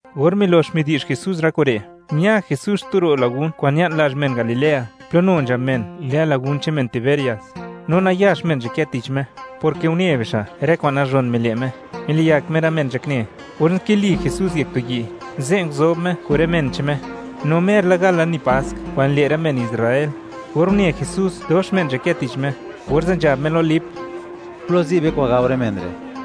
Or milox midi'zh Jesús rë kure', ña Jesús xtu ro' lagun kwa'n ña'n lazh men Galilea, plo nu nzhab men lë lagun che'n men Tiberias. No nayax men nzhakë tich Me, porke une bixa' rë kwa'n nazhon mile' Me, miliyak Me rë men nzhakne, orze' nkili Jesús yek tu yi', ze' nguzob Me kun rë men che'n Me; no mer la gal lani Pask kwa'n nile' rë men Israel. Or une Jesús dox men nzhakë tich Me, orze' nzhab Me lo Lip: ―¿Plo zi' be kwa'n gao rë men re'?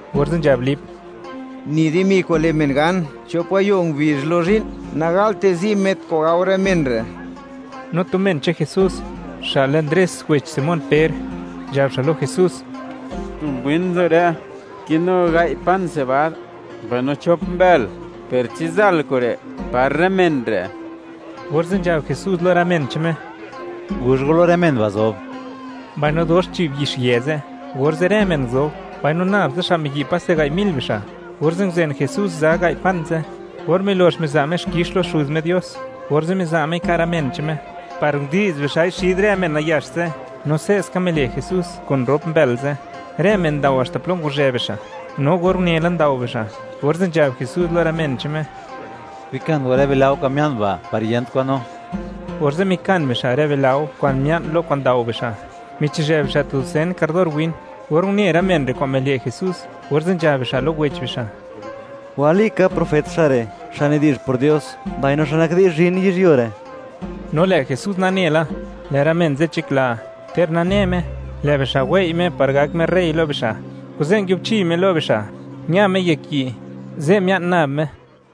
orze' nzhab Lip: ―Ni di dimi kwa'n le' men gan chop gayo' ngubizh lo zhi'n nagalte zi' met kwa'n gao rë men re'. No tu men che'n Jesús xa' lë Ndres wech Simón Per, nzhab xa' lo Jesús: ―Tu mbwin nzo re' kinu gai' pan sebad, mbaino chop mbël, per, ¿chi zal kure' par rë men re'? Orze' nzhab Jesús lo rë men che'n Me: ―Guzh go lo rë men ba' zob. Mbaino dox nzhi'b yixyë ze', orze' rë men nguzob, no nab tsa xa' miyi' paste gai' mil bixa', orze' nguzen Jesús za gai' pan ze'; or milox miza' Me xkix lo Xuz Me Dios, orze' miza' Mei ka' rë men che'n Me, par ndi'z bixa'i xid rë men nayax ze', no se'ska mile' Jesús kun rop mbël ze'; rë men ndao haxta plo ngwazhë bixa', no or unela ndao bixa', orze' nzhab Jesús lo rë men che'n Me: ―Bikan go rë bilao kwa'n mia'n ba', par yent kwan nu. Orze' mikan bixa' rë bilao kwa'n mia'n lo kwa'n ndao bixa', michizhë bixa' tu dusen kardor win. Or une rë men re' kwa'n mile' Jesús, orze' nzhab bixa' lo wech bixa': ―Walika, profet xa' re', xa' nidi'zh por Dios, mbaino xa' nak di'zh zhin yizhyuo re'. No lë' Jesús nane la, lë' rë men ze' nzhakla, ter nane Me, lë' bixa' wei' Me par gak Me rey lo bixa'. Kuze' nguiubchi Me lo bixa', ña Me yek yi', ze' mia'n nab Me.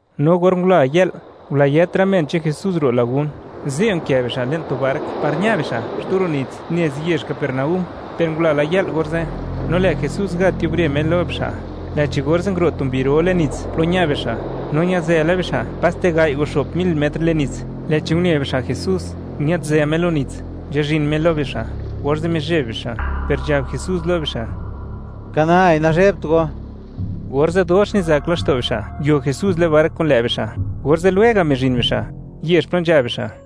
No or ngula yë'l, ngulayët rë men che'n Jesús ro' lagun, ze' nkë bixa' le'n tu bark par ña bixa' xtu ro' nits nez yezh Capernaúm, per ngula la yë'l orze', no lë' Jesús nagat yubre Me lo bixa', lë'chi orze' nguro' tu mbi ro le'n nits plo ña bixa', no ñazë la bixa' paste gai' o xo'p mil metr le'n nits, lë'chi une bixa' Jesús, ñëdzë Me lo nits, nzhazhin Me lo bixa', orze' mizheb bixa', per nzhab Jesús lo bixa': ―¡Ka nai, nazhebt go! Orze' dox nizak laxto' bixa' nguio Jesús le'n bark kun lë' bixa', orze' lwega' mizhin bixa' yezh plo nzha bixa'.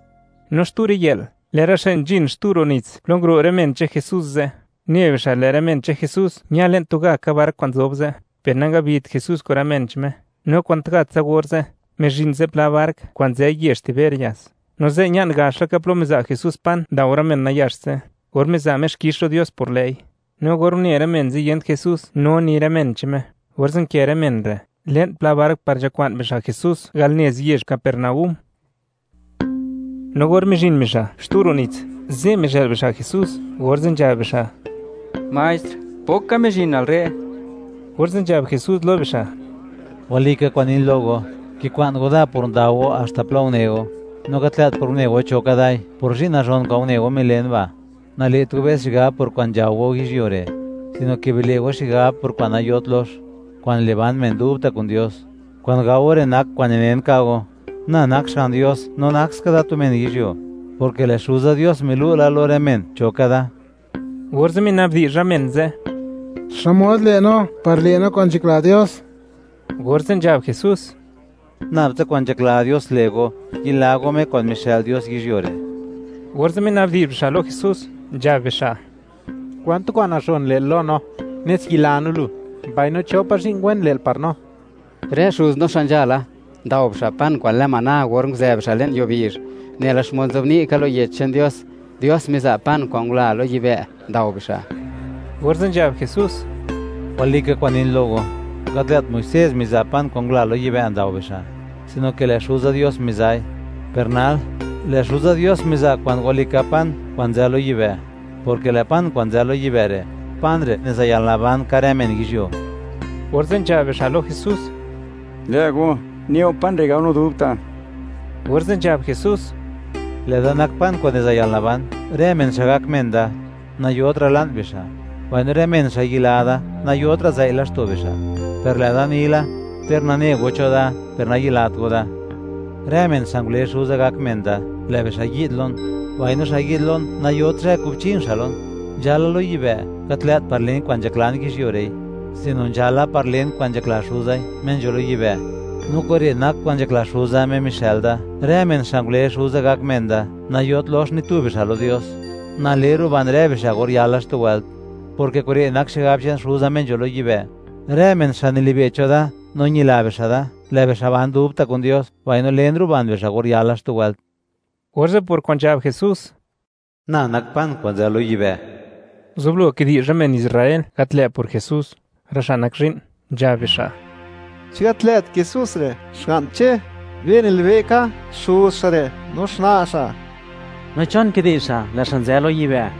No xtu riyë'l, lë' rë xa' nzhin xtu ro' nits plo nguro' rë men che'n Jesús ze', une bixa', lë' rë men che'n Jesús ña le'n tugaka bark kwa'n nzob ze', per nangabit Jesús kun rë men che'n Me, no kwantgatsa orze', mizhin zipla bark kwa'n nzë yezh Tiberias, no ze' ña'n gax laka plo miza' Jesús pan ndao rë men nayax ze', or miza' Me xkix lo Dios por lë'i. No or une rë men ze', yent Jesús no ni rë men che'n Me, orze' nkë rë men re' le'n pla bark par nzhakwa'n bixa' Jesús al nez yezh Capernaúm. No or mizhin bixa' xtu ro' nits, ze' mizhë'l bixa' Jesús, orze' nzhab bixa': ―Maestr, ¿pok ka mizhinal re'? Orze' nzhab Jesús lo bixa': ―Walika kwa'n nin lo go, kikwa'n go da por ndao go haxta plo une go; no gat lë't por une go cho ka dai, por zhi'n nazhon kwa'n une go milen ba'. Nale't go be's xigab por kwa'n nzhao go yizhyuo re', sino ke bile' go xigab por kwa'n nayot lox, kwa'n le' ban men dubta' kun Dios. Kwa'n gao go re' nak kwa'n ninen ka' go, na nak Xga'n Dios no nak ska da tu men yizhyuo, porke lë' Xuza Dios milu' la lo rë men cho ka da. Orze' mina'bdi'zh rë men ze': ―¿Xmod le' no par le' no kwa'n nzhakla Dios? Orze' nzhab Jesús: ―Nabtsa kwa'n nzhakla Dios le' go, yila go Me kwa'n mixë'l Dios yizhyuo re'. Orze' mina'bdi'zh bixa' lo Jesús, nzhab bixa': ―¿Kwan tu kwa'n nazhon le'l lo no, nes yila no lu?, mbaino, ¿cho pa' zhi'n wen lë'l par no? Rë xuz no xa' nzhala, ndao bixa' pan kwa'n lë maná or nguzë bixa' le'n yuo bizh, nela xmod nzobni' ka lo Yech che'n Dios: “Dios miza' pan kwa'n ngula lo yibë', ndao bixa'.” Orze' nzhab Jesús: ―Walika kwa'n nin lo go, gat lë't Muisés miza' pan kwa'n ngula lo yibë' ndao bixa', sino ke lë' Xuza Dios miza'i; per nal, lë' Xuza Dios miza' kwa'n walika pan kwa'n nzë lo yibë', porke lë' pan kwa'n nzë lo yibë' re', pan re' niza' yalnaban ka' rë men yizhyuo. Orze' nzhab bixa' lo Jesús: ―Lë' go, ne'u pan re' gao no dubta'. Orze' nzhab Jesús: ―Lë'da nak pan kwa'n niza' yalnaban; rë men xa' gak men da, nayotra' la'n bixa'; mbaino rë men xa' yila da, nayotra' zëi' laxto' bixa', per lë'da ni la, ter nane go cho da, per nayilat go da. Rë men xa' ngule Xuza gak men da, lë' bixa' yi'd lon; mbaino xa' yi'd lon, nayot zhë kubchin xa' lon. Nzhala lo yibë', gat lë't par len kwa'n nzhaklan yizhyuo re'i, sino nzhala par len kwa'n nzhakla Xuzai, Me nzho lo yibë'. No kure' nak kwa'n nzhakla Xuza, Me mixë'l da: Rë men xa' ngule Xuza gak men da, nayot lox ni tu bixa' lo Dios; na le ruban rë bixa' or yala xtu wëlt, porke kure' nak xigab che'n Xuza Me nzho lo yibë': Rë men xa' nilibe' cho da no ñila bixa' da, lë' bixa' ban dubta' kun Dios, mbaino len ruban bixa' or yala xtu wëlt. Orze' por kwa'n nzhab Jesús: “Na nak pan kwa'n nzë lo yibë'”, nguzublo kidi'zh rë men Israel, gat lë' por Jesús, rë xa' nak zhi'n, nzhab bixa': ―¿Chi gat lë't Jesús re', xga'n Che? Be nilibe' ka xuz xa' re' no xna' xa'. ¿No chon kidi'zh xa', lë' xa' nzë lo yibë'?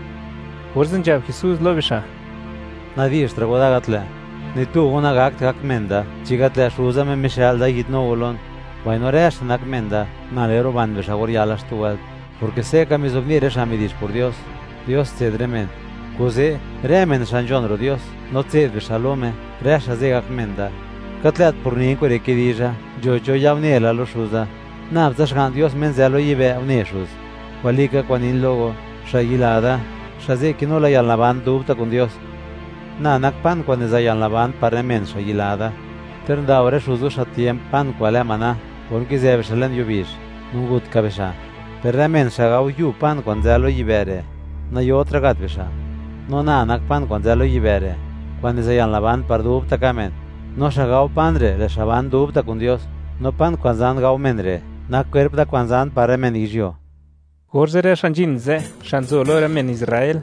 Orze' nzhab Jesús lo bixa': ―Nadi'zhtra' go da gat lë'. Ni tu go nagakt gak men da, chi gat lë' Xuza Me mixë'l da yi'dnu go lon; mbaino rë xa' nak men da, na le ruban bixa' or yala xtu wëlt, porke se' ka mizobni' rë xa' midi'zh por Dios: “Dios tse'd rë men.” Kuze', rë men xa' nzhon ro' Dios no tse'd bixa' lo Me, rë xa' ze' gak men da. Gat lë't por nin kure' kidizha, nzho cho ya une la lo Xuza; nab tsa Xga'n Dios Me nzë lo yibë', une Xuz. Walika kwa'n nin lo go; xa' yila da, xa' ze' kinu la yalnaban dubta' kun Dios. Na nak pan kwa'n niza' yalnaban par rë men, xa' yila da. Ter ndao rë xuz go xa' tiemp, pan kwa'n lë maná or nkizë bixa' le'n yuo bizh, no ngut ka bixa'; per rë men xa' gao yub pan kwa'n nzë lo yibë' re', nayotra' gat bixa'. No na nak pan kwa'n nzë lo yibë' re', kwa'n niza' yalnaban par dubta' ka' men; no xa' gao pan re', lë' xa' ban dubta' kun Dios, no pan kwa'n zan gao men re' nak kwerp da kwa'n zan par rë men yizhyuo. Orze' rë xa' nzhin ze', xa' nzo lo rë men Israel,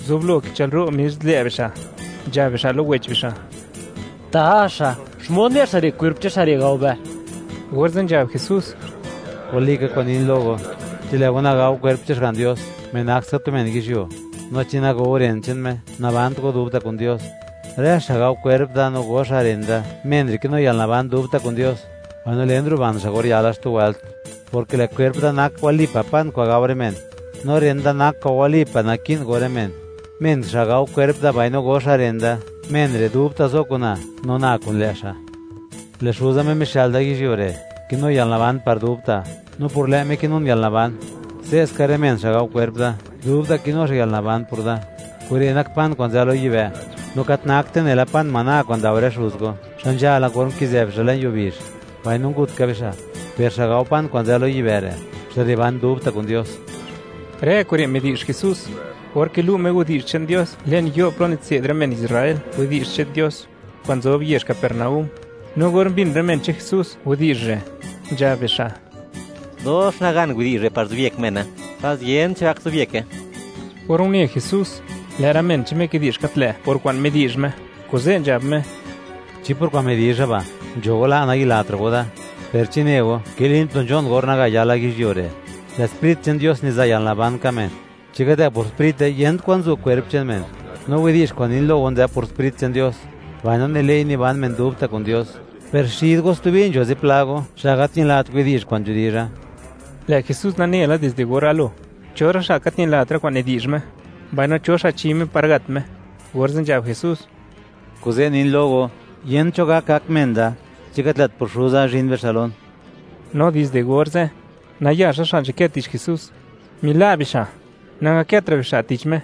nguzublo kichë'lro' mis lë' bixa', nzhab bixa' lo wech bixa': ―¡Taxa!, ¿xmod ne' xa' re' kwerp che'n xa' gao be? Orze' nzhab Jesús: ―Walika kwa'n nin lo go, chi lë' go nagao kwerp che'n Xga'n Dios, Me nak ska tu men yizhyuo, no chi nago go ren che'n Me, nabant go dubta' kun Dios. Rë xa' gao kwerp da no go xa' ren da, men re' kinu yalnaban dubta' kun Dios; mbaino len ruban xa' or yala xtu wëlt, porke lë' kwerp da nak wali pa' pan kwa'n gao rë men, no ren da nak kwa'n wali pa' naki'n go rë men. Men xa' gao kwerp da mbaino go xa' ren da, men re' dubta' zo kun na, no na kun lë' xa'. Lë' Xuza, Me mixë'l da yizhyuo re', kinu yalnaban par dubta', no por lë' Me kinun yalnaban. Se'ska, rë men xa' gao kwerp da, dubta' kinu xa' yalnaban por da. Kure' nak pan kwa'n nzë lo yibë', no gat nakte nela pan maná kwa'n ndao rë xuz go, xa' nzhala or nkizë bixa' le'n yuo bizh, mbaino ngut ka bixa'. Per xa' gao pan kwa'n nzë lo yibë' re', xa' re' ban dubta' kun Dios. Rë kure' midi'zh Jesús or kilu' Me widi'zh che'n Dios le'n yo' plo nitse'd rë men Israel widi'zh che'n Dios, kwa'n nzob yezh Capernaúm. No or mbin rë men che'n Jesús widi'zh re', nzhab bixa': ―Dox nagan widi'zh re' par zobyek mene; pas yent cho gak zobyeke. Or une Jesús, lë' rë men che'n Me kidi'zh gat lë' por kwa'n midi'zh Me, kuze' nzhab Me: ―¿Chi por kwa'n midizha ba', nzho go la', nayilatra' go da? ¿Per chi ne go, kilin plo nzho'n or naga yala yizhyuo re'? Lë' Sprit che'n Dios niza' yalnaban ka' men; chi gat lë' por Sprite, yent kwa'n zu' kwerp che'n men; no widi'zh kwa'n nin lo go nzë por Sprit che'n Dios, mbaino nile'i niban men dubta' kun Dios. Per xid go stubi nzho zipla go xa' gat ñilat widi'zh kwa'n nidizha. Lë' Jesús nane la dizde or galo, cho rë xa' gat ñilat rë kwa'n nidi'zh Me, mbaino cho xa' chi Me par gat Me, orze' nzhab Jesús: ―Kuze' nin lo go, yent cho gak, gak men da chi gat lë't por Xuza zhin bixa' lon. No dizde orze' nayax rë xa' nzhakë tich Jesús, mila' bixa', nangakëtra' bixa' tich Me.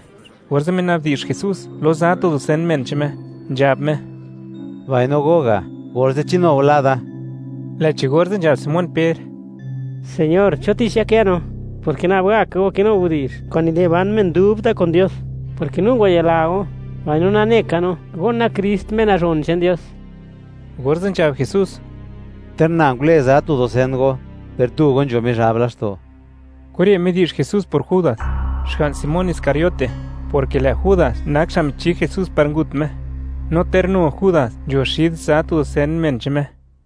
Orze' mina'bdi'zh Jesús lo za tu dusen men che'n Me, nzhab Me: ―Mbaino go ga', orze', ¿chi nu go la' da? Lë'chi orze' nzhab Simón Per: ―Señor, ¿cho tich yakë no?, porke nab gaka go kinu widi'zh kwa'n nile' ban men dubta' kun Dios, porke no ngwayila la go, mbaino nane ka no, go nak Krist, Me Nazhon che'n Dios. Orze' nzhab Jesús: ―Ter na ngule za tu dusen go, ¡per tu go, nzho Mizhab laxto'! Kure' midi'zh Jesús por Judas, xga'n Simón Iscariote; porke lë' Judas nak xa' michi Jesús par ngut Me, no ter nu Judas nzho xid za tu dusen men che'n Me.